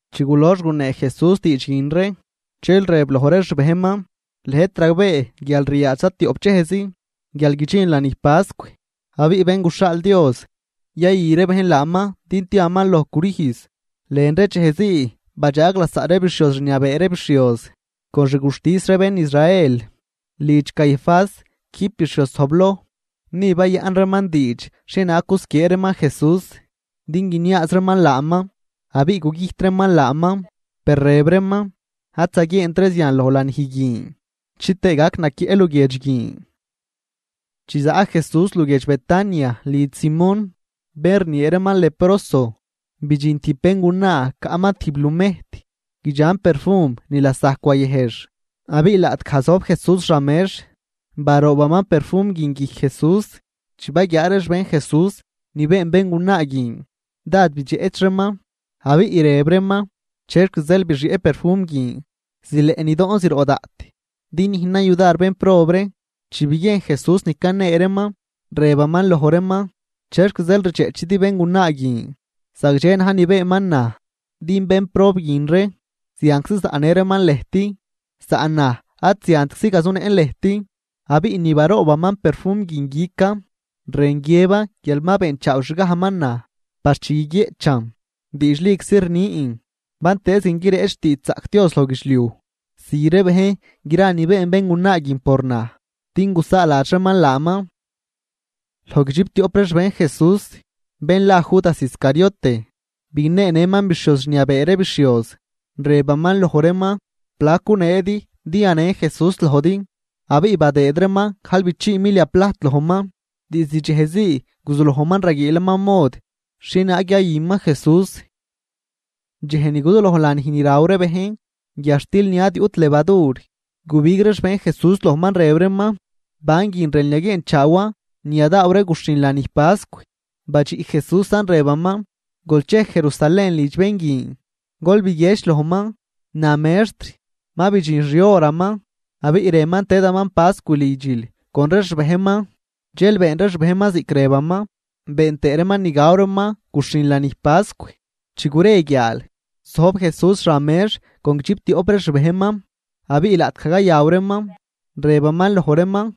Chi gulox gunee Jesús diidx guin ree, dxel rëb loj ree xbejnman: ―Lëjt ragbee guial ryaadx zatioꞌp dxejzi guial guidxin lanij pascw, abiꞌ Bén guxhaal Dios yayü ree bejn laaman din tiaman loj crüjz. Lën ree dxejzii badxaag lasaꞌ ree bixhioz rniabee ree bixhioz, con xguxtis ree bén Israel, lidx Caifás quijb bixhioz zojbloj. Ni bayaꞌn reeman diidx xhienaag gusquiee reeman Jesús din guiniaaz reeman laaman, abiꞌ gugüjt reeman laaman. Per rëb reeman: ―Ad zaguieent ree zian loj lanij guin chitëë gac naquieꞌ luguiedx guin. Chi zaꞌ Jesús luguiedx Betania lidx Simón, bén rniee reeman Leproso, bidxin tijb béngunaa caꞌman tijb lumejt guidxan perfum ni lasajc wayëjx. Abiꞌ laꞌtgaj zojb Jesús xan mex, baroobaman perfum guin guijc Jesús. Chi baguiaa ree xbejn Jesús ni been béngunaa guin, dád bidxeꞌch reeman, abiꞌ rëb reeman: ―¿Chexc zeel bixieꞌ perfum guin? Zileꞌ nidoꞌn zroꞌ daꞌt din nüjnan yudar bénprob ree. Chi biguiejn Jesús ni canee reeman, rëbaman loj reeman: ―¿Chexc zeel rdxeꞌchidi béngunaa guin? Zagdxe na̱j ni beenman naj. Din bénprob guin ree zianczi zaꞌnë reeman lëjt, saꞌn naj ad ziantczi gazunëꞌn lëjt. Abiꞌ ni baroobaman perfum guin guican, rën guiëban guial ma beenchaaw xgajman naj par chi guiguieꞌchan. Diidxliczi rnin, bantëëz guin guireꞌch xtiidxzaꞌc Dios loj guidxliuj, zü ree bejn gra ni been béngunaa guin por naj, din gusaaladx reeman laaman. Loj guidxiptioꞌp ree xbejn Jesús, bén la Judas Iscariote, bigneenëman bixhioz rniabee ree bixhioz, rëbaman loj reeman: ―¿Plac guneedi din yanen Jesús lojdi? Abiꞌ badëëd reeman gajlbichii milia plajt lojman. Diizd dxejzii guzulojman raguiilaman mod xhienaag yayüman Jesús. Dxej ni guzuloj lanij ni raw ree bejn guiadxtil ni ad yuꞌt levadur, gubig ree xbejn Jesús lojman, rëb reeman: ―¿Ban guin rënl yaguieenchaawan ni yadaaw ree guxhin lanij pascw? Badxiꞌ Jesúsan rëbaman: ―Gol chej Jerusalén lidx bén guin, gol biguiedx lojman: “Na Mextr: Ma bidxin xihoraman abiꞌ rënman tëdaman pascw lidxil con ree xbejnman.” Dxel been ree xbejnman ziꞌc rëbaman, been tëë reeman ni gaw reeman guxhin lanij pascw. Chi gure guiaal, zojb Jesús xan mex con guidxiptioꞌp ree xbejnman. Abiꞌ laꞌtgaj cayaw reeman, rëbaman loj reeman: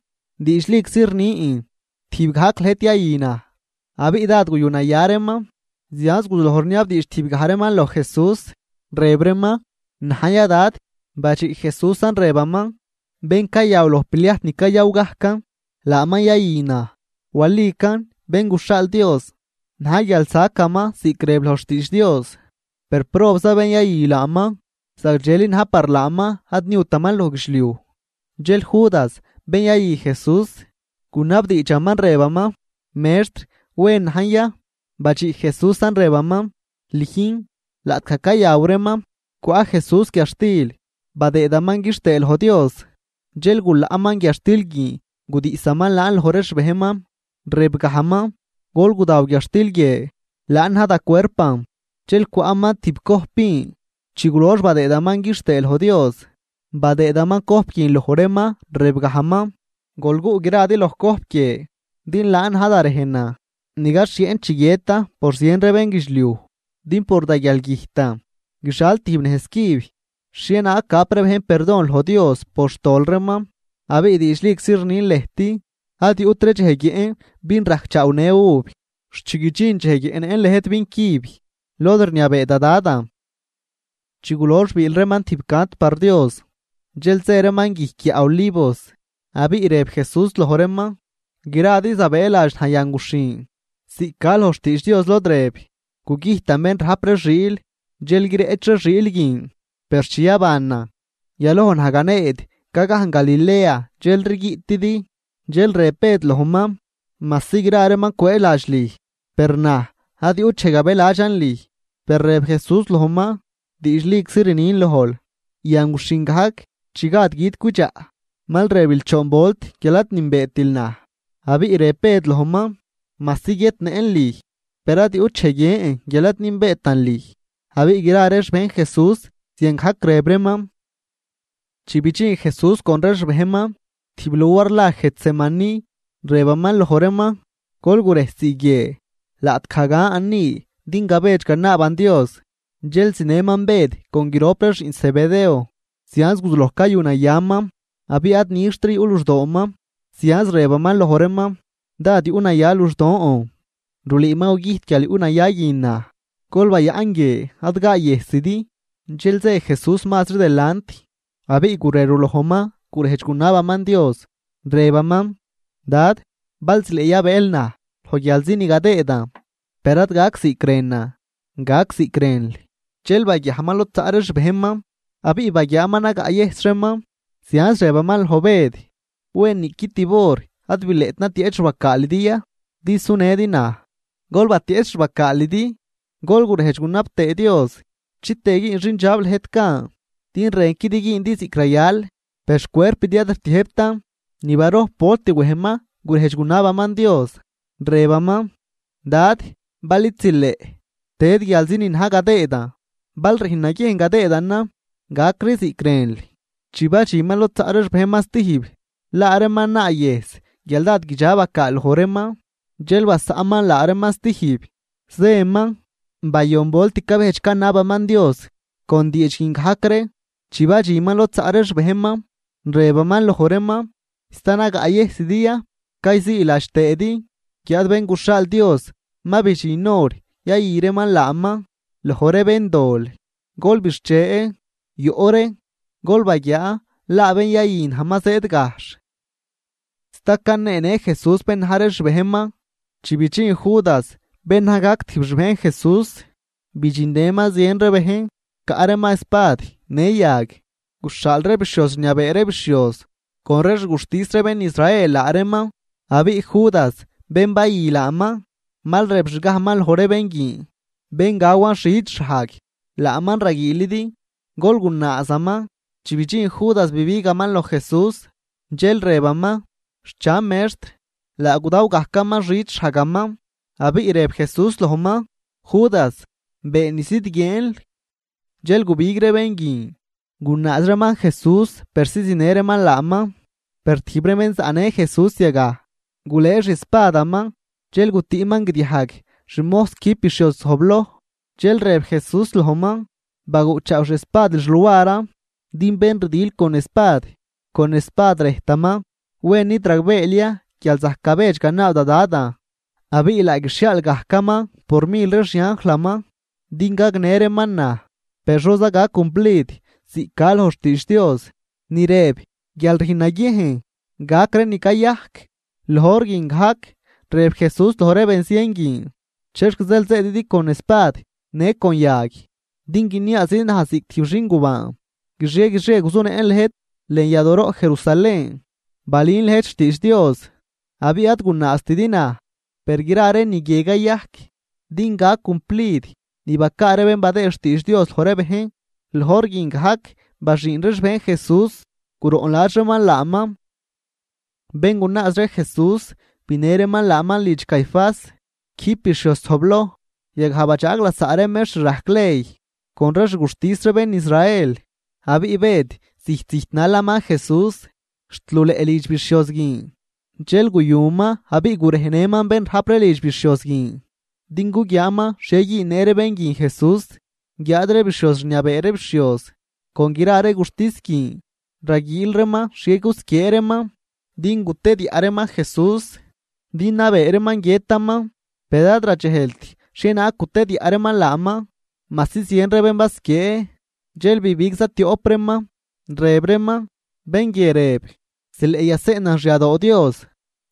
―Diidxliczi rnin, tijb gajc lëjt yayü naj. Abiꞌ dád guyunaya reeman, zianz guzuloj rniabdiidx tijbgaj reeman loj Jesús, rëb reeman: ―¿Najn ya, Dad? Badxiꞌ Jesúsan, rëbaman: ―Bén cayaw loj pliajt ni cayaw gajcan, laaman yayü naj. Walican, Bén guxhaal Dios na̱j guial sacaman ziꞌc rëb loj xtiidx Dios. Per ¡probza bén yayü laaman!, zagdxeli na̱j par laaman ad niutaman loj guidxliuj. Dxel Judas bén yayü Jesús, gunabdiidxaman rëbaman: ―Mextr, ¿wen najn ya? Badxiꞌ Jesúsan, rëbaman: ―Lüjn. Laꞌtgaj cayaw reeman, cwaꞌ Jesús guiadxtil, badëëdaman quixtëë loj Dios. Dxel gulaꞌman guiadxtil guin gudiꞌsaman laan loj ree xbejnman, rëbgajman: ―Gol gudaw guiadxtil guie, laan na̱j da cuerpan. Dxel cwaꞌman tib cojp vin, chi gulox badëëdaman quixtëë loj Dios, badëëdaman cojp guin loj reeman, rëbgajman: ―Gol guꞌ gradi loj cojp guie. Din laan na̱j da rejnan ni gaxhieꞌn chi guiëtan por zien ree bénguidxliuj. Din por da guialgüjtan guixal tijb nejz cüb xhienaag gap ree bejn perdon loj Dios por xtol reeman. Abiꞌ diidxliczi rnin lëjt ad yuꞌtri dxej guiëꞌn vin rajcchaawnë uv, xt chi guidxin dxej guiëꞌnëꞌn lëjt vin cüb lod rniabee da Dadan. Chi gulox biil reeman tijb cant par Dios, dxel zë reeman guijc guiaꞌ Olivos. Abiꞌ rëb Jesús loj reeman: ―Gradi zabëëladx naj yan guxhin, ziꞌc ca loj xtiidx Dios lod rëb: “Gugüjtan bén rajp ree xiil, dxel guireꞌch ree xiil guin.” Per chi yabanan, yaloj naj ganeed ga gajn Galilea dxelri guiꞌtidi. Dxel rëb Bëd lojman: ―Majsi gra reeman cwëëladx lüj per naj ad yuꞌt dxej gabëladxan lüj. Per rëb Jesús lojman: ―Diidxliczi rnin lojl, yan guxhin gajc chi gad gui̱d cwidxaꞌ, mal rëbil choon volt guial ad nünbeetil naj. Abiꞌ rëb Bëd lojman: ―Majsi guiëtnëꞌn lüj, per ad yuꞌt dxej guiën guial ad nünbeetan lüj. Abiꞌ gra ree xbejn Jesús ziangajc rëb reeman. Chi bidxin Jesús con ree xbejnman tijb luar la Getsemaní, rëbaman loj reeman: ―Gol gurejsii guie, laꞌtgaj gan ni din gabedx ganaaban Dios. Dxel zinëman Bëd con grop ree xiꞌn Zebedeo, zianz guzuloj cayunayaman abiꞌ ad nixtri yuꞌ luxdooman. Zianz rëbaman loj reeman: ―Dád yuꞌnaya luxdoon, rulüü ma gugüjt guialyuꞌnaya guin naj. Gol bayaꞌn guie ad gaayëjsidi. Dxel zë Jesús mazri delant abiꞌ gurerulojman gurejdx gunabaman Dios, rëbaman: ―Dad, bal zileꞌ yabëël naj loj guialzi ni gadëëdan, per ad gac ziꞌc rënan, gac ziꞌc rënl. Dxel baguiajman lod zaꞌ ree xbejnman, abiꞌ baguiaaman nagaꞌyëjs reeman, zianz rëbaman loj Bëd: ―¿Wen niꞌqui tib hor ad bileꞌt natieꞌch xbacaalidi ya, din sunëdi naj? Gol batieꞌch xbacaalidi gol gurejdx gunab tëë Dios, chitëë güün xindxab lëjt gan, din rënquidi güündi ziꞌc rayal, per xcuerpidi ad rtiëjbtan. Ni barojp volt wejman gurejdx gunabaman Dios, rëbaman: ―Dad, bal id zileꞌ tëd guialzi ni na̱j gadëëdan, bal rüjn naguiejn gadëëdanan gacri ziꞌc rënl. Chi badxinman lod zaꞌ ree xbejnman stijb, laa reeman naayëjs guial dád guidxa bacaal loj reeman. Dxel basaꞌnman laa reeman stijb, zëman, bayon volt cabejdx canabaman Dios con diidx guin gajc ree. Chi badxinman lod zaꞌ ree xbejnman, rëbaman loj reeman: ―¿Sta nagaꞌyëjsidi ya, cayziiladx tëëdi? Guiáad Bén guxhaal Dios ma bidxin hor yayü reeman laaman loj ree béndol. Gol bixche, yoꞌ ree, gol baguiaa laa bén yayü naj ma zëëd gajxh. Sta caneenë Jesús bén na̱j ree xbejnman, chi bidxin Judas bén naj gajc tijb xbejn Jesús. Bidxinnëman zien ree bejn, caꞌ reeman espad në yag. Guxhaal ree bixhioz rniabee ree bixhioz con ree xguxtis ree bén Israel laa reeman. Abiꞌ Judas bén bayü laaman mal rëbxgajman loj ree bén guin: “Bén gawan xid xhajg, laaman raguiilidi, gol gunaazaman.” Chi bidxin Judas bibigaman loj Jesús, dxel rëbaman: ―¡Xchan, Mextr! Laa gudaw gajcaman xid xhajgaman. Abiꞌ rëb Jesús lojman: ―Judas, been ni zidguieenl. Dxel gubig ree bén guin, gunaaz reeman Jesús persi zinë reeman laaman. Per tijb ree bén zaꞌnë Jesús yagaj, gulëë xiespadaman dxel gutüꞌman guidiajg xmojs quijb bixhioz zojbloj. Dxel rëb Jesús lojman: ―Baguꞌchaaw xiespadil xluaran. Din bén rdil con espad, con espad rëjtaman. ¿Wen, id ragbeel ya guial zajc gabedx ganaab da Dadan, abiꞌ laa guixhiaal gajcaman por mil ree xianjlaman din gagnë reeman naj? Per ¿xoza gac cumplid ziꞌc ca loj xtiidx Dios ni rëb guial rüjn naguiejn gac ree ni cayajc? Loj hor guin gajc rëb Jesús loj ree benzien guin: ―¿Chexc zeel zëëdidi con espad në con yag din guiniaazidi naj ziꞌc tijb xingubaan? Guixie guixie guzunëꞌn lëjt lën yadooroꞌ Jerusalén balün lëjt xtiidx Dios, abiꞌ ad gunaaztidi naj. Per gra ree ni guie cayajc din gac cumplid ni bacaa ree bén badëë xtiidx Dios loj ree bejn. Loj hor guin gajc baxüün ree xbejn Jesús, guroꞌnladx reeman laaman. Bén gunaaz ree Jesús binë reeman laaman lidx Caifás, quijb bixhioz zojbloj, yagaj badxaag lasaꞌ ree mextr rajc ley con ree xguxtis ree bén Israel. Abiꞌ Bëd zijt zijt nalaman Jesús, xt luleꞌ lidx bixhioz guin. Dxel guyuman abiꞌ gurejnëman bén rajp ree lidx bixhioz guin, din guguiaaman xhie güünnë ree bén guin Jesús. Guiáad ree bixhioz rniabee ree bixhioz con gra ree guxtis guin raguiil reeman xhie gusquiee reeman din gutediaꞌ reeman Jesús din nabee reeman guiëtaman. Per ad radxejlt xhienaag gutediaꞌ reeman laaman majsi zien ree bén basquiee. Dxel bibig zatioꞌp reeman, rëb reeman: ―Bén guie rëb: “Zileꞌ yaseꞌnan xyadoo Dios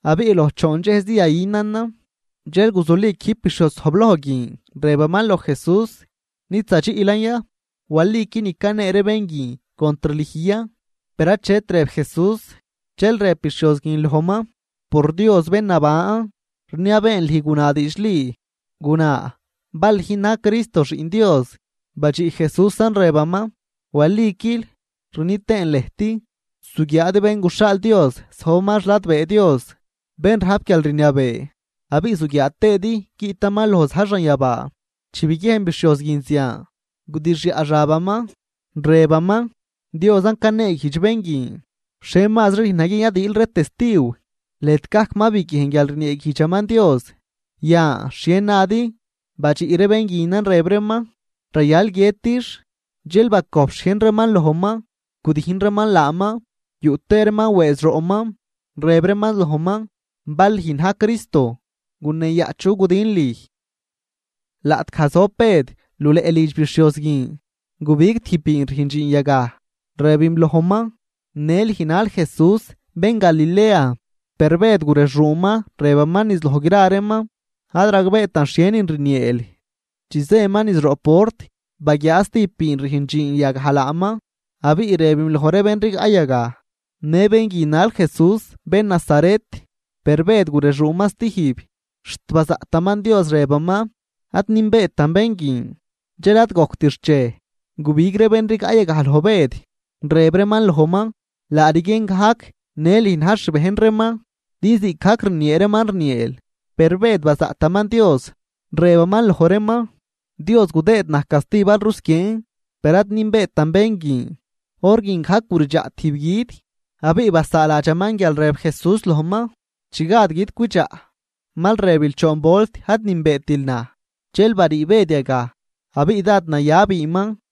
abiꞌ loj choon dxejzi yayünanan.” Dxel guzuli quijb bixhioz zojbloj guin, rëbaman loj Jesús: ―¿Nid zadxiꞌlan ya? ¿Waliqui ni canee ree bén guin contr lüj ya? Per achet rëb Jesús. Dxel rëb bixhioz guin lojman: ―Por Dios bén naban, rniabeen lüj guna diidxli. Guna bal lüjn na̱j Cristo, Xiꞌn Dios. Badxiꞌ Jesúsan rëbaman: ―Waliquil. Rni tëën lëjt, zuguiaadi Bén guxhaal Dios zojbaman xladbee Dios bén rajp guialrniabee abiꞌ zuguiaa tëëdi guiꞌtaman loj za̱j xanyabaa. Chi biguiejn bixhioz guin zian, gudixyaꞌ xabaman, rëbaman: ―Diosan caneeguijdx bén guin. ¿Xhie mazri rüjn naguiejn yadiil ree testiw? Lëjt gajc ma biguiejn guial rnieeguijdxaman Dios. Yan, ¿xhie nadi? Badxiꞌ ree bén guinan rëb reeman: ―Rayal guiëtix. Dxel bacojp xhiejn reeman lojman, gudijn reeman laaman, yuꞌ tëë reeman wëëz roꞌman, rëb reeman lojman: ―Bal lüjn na̱j Cristo, guneeyaꞌ chu gudin lüj. Laꞌtgaj zojb Bëd luleꞌ lidx bixhioz guin, gubig tijb biin rüjn dxiin yagaj, rëbim lojman: ―Në lüj nal Jesús, bén Galilea. Per Bëd gurexuuman, rëbaman niz loj gra reeman: ―Ad ragbeetan xhienin rnieel. Chi zëman niz roꞌ port baguiaa stijb biin rüjn dxiin yagaj laaman, abiꞌ rëbim loj ree bén rigaꞌ yagaj: ―Në bén guin nal Jesús bén Nazaret. Per Bëd gurexuuman stijb, xt bazaꞌtaman Dios, rëbaman: ―Ad nünbeetan bén guin. Dxel ad gojct xchej, gubig ree bén rigaꞌ yagaj loj Bëd, rëb reeman lojman: ―Laa rguien gajc në lüj na̱j xbejn reeman, din ziꞌcgajc rniee reeman rnieel. Per Bëd bazaꞌtaman Dios, rëbaman loj reeman: ―Dios gudëëd naj casti bal rusquieen, per ad nünbeetan bén guin. Hor guin gajc guridxaꞌ tijb gui̱d. Abiꞌ basaaladxaman guial rëb Jesús lojman: “Chi gad gui̱d cwidxaꞌ, mal rëbil choon volt ad nünbeetil naj.” Dxel barii Bëd yagaj abiꞌ dád naya biinman.